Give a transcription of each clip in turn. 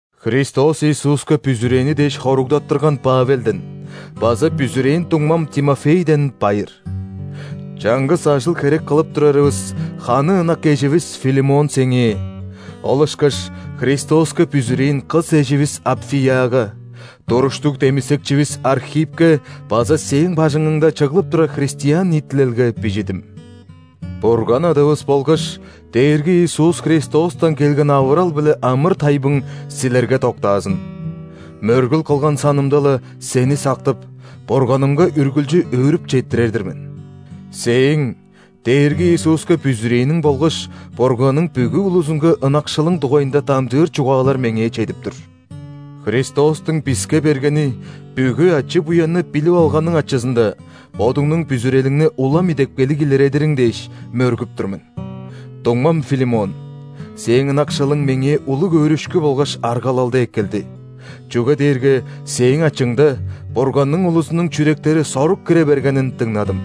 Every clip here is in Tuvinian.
Христос Иисуска бүзүрээни дээш хоругдаттырган Павелден база бүзүрээн дуңмам Тимофейден байыр. Чаңгыс ажыл-херек кылып турарывыс ханы ынак эживис Филимон сеңээ, ол ышкаш Христоска бүзүрээн кыс эживис Апфияга, туруштуг демисекчивис Архиппке база сээң бажыңыңда чыглып турар христиан ниитилелге бижидим. Бурган Адавыс болгаш Дээрги Иисус Христостан келген авырал биле амыр-тайбың силерге доктаазын! Мөргүл кылган санымда-ла, сени сактып, Бурганымга үргүлчү өөрүп четтирер-дир мен. Сээң Дээрги Иисуска бүзүрээниң болгаш Бурганның бүгү улузунга ынакшылың дугайында дамчыыр чугаалар меңээ чедип тур. Христостуң биске бергени бүгү ачы-буянны билип алганың ачызында бодуңнуң бүзүрелиңни улам идепкейлиг илередириң дээш, мөргүп тур мен. Дуңмам Филимон, сээң ынакшылың меңээ улуг өөрүшкү болгаш аргалалды эккелди, чүге дээрге сээң ачыңда Бурганның улузунуң чүректери сорук кире бергенин дыңнадым.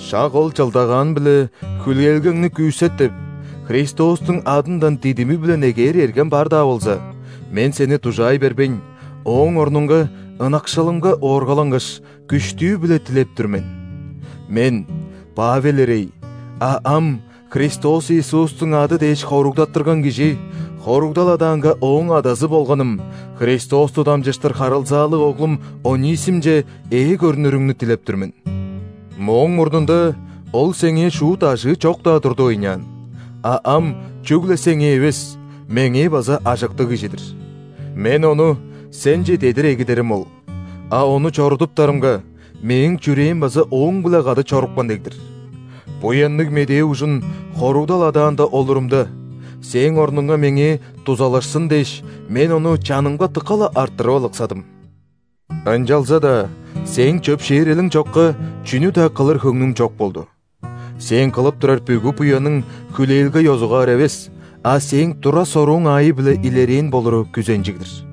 Шак ол чылдагаан-биле хүлээлгеңни күүсет деп, Христостуң адындан дидими-биле негээр эргем бар-даа болза, мен сени дужаай бербейн, ооң орнунга, ынакшылымга ооргалангаш, күштүү-биле дилеп тур мен. Мен, Павел ирей, а ам Христос Иисустуң ады дээш хоругдаттырган кижи, хоругдал адаанга ооң адазы болганым, Христосту дамчыштыр харылзаалыг оглум Онисимче ээ көрнүрүңнү дилеп тур мен. Мооң мурнунда ол сеңээ шуут ажыы чок-даа турду ыйнаан, а ам чүгле сеңээ эвес, меңээ база ажыктыг кижи-дир. Мен ону сенче дедир эгидерим ол, а ону чорудуптарымга, мээң чүрээм база ооң-биле кады чорупкан дег-дир. Буянныг Медээ ужун хоругдал адаанда олурумда, сээң орнуңга меңээ дузалашсын дээш, мен ону чанымга дыка-ла арттырып алыксадым. Ынчалза-даа сээң чөпшээрелиң чокка чүнү-даа кылыр хөңнүм чок болду. Сээң кылып турар бүгү буяның хүлээлге ёзугаар эвес, а сээң тура-сорууң аайы-биле илерээн болуру күзенчиг-дир.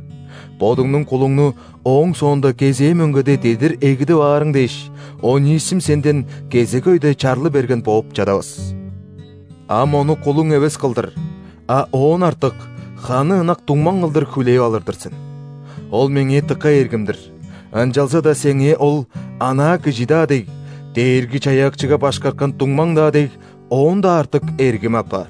Бодуңнуң кулуңну ооң соонда кезээ мөңгеде дедир эгидип аарың дээш, Онисим сенден кезек өйде чарлы берген бооп чадавас. Ам ону кулуң эвес кылдыр, а оон артык – ханы ынак дуңмаң кылдыр хүлээп алыр-дыр сен. Ол меңээ дыка эргим-дир, ынчалза-даа сеңээ ол, анаа кижи-даа дег, Дээрги-Чаяакчыга башкарткан дуңмаң-даа дег, оон-даа артык эргим апаар.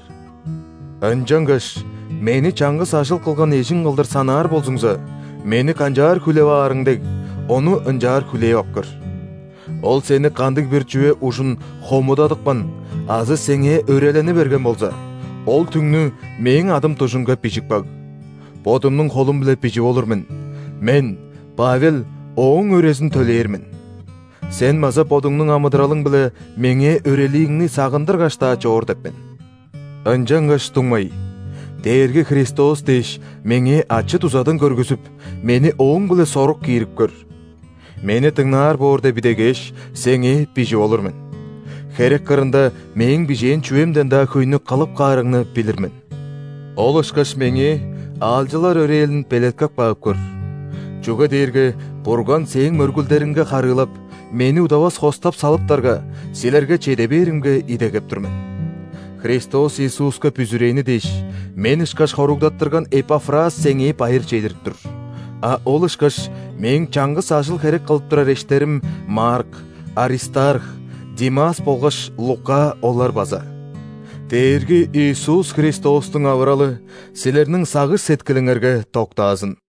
Ынчангаш мени чаңгыс ажыл кылган эжиң кылдыр санаар болзуңза, мени канчаар хүлээп аарың дег, ону ынчаар хүлээп ап көр. Ол сени кандыг-бир чүве ужун хомудадыпкан азы сеңээ өрелени берген болза, ол түңнү мээң адым дужунга бижип каг. Бодумнуң холум-биле бижип олур мен: мен, Павел, ооң өрезин төлээр мен. (Сен база бодуңнуң амыдыралың-биле меңээ өрелииңни сагындыргаш-даа чоор деп мен.) Ынчангаш, дуңмай, Дээрги Христос дээш, меңээ ачы-дузадан көргүзүп, мени ооң-биле сорук киирип көр. Мени дыңнаар боор деп идегээш, сеңээ бижип олур мен. Херек кырында мээң бижээн чүвемден-даа хөйнү кылып каарыңны билир мен. Ол ышкаш меңээ аалчылар өрээлин белеткеп каап көр. Чүге дээрге Бурган сээң мөргүлдериңерге харыылап, мени удавас хостап салыптарга, силерге чеде бээримге идегеп тур мен. Христос Иисуска бүзүрээни дээш, мен ышкаш хоругдаттырган Эпафрас сеңээ байыр чедирип тур, а ол ышкаш мээң чаңгыс ажыл-херек кылып турар эштерим Марк, Аристарх, Димас болгаш Лука олар база. Дээрги Иисус Христостуң авыралы силерниң сагыш-сеткилиңерге доктаазын.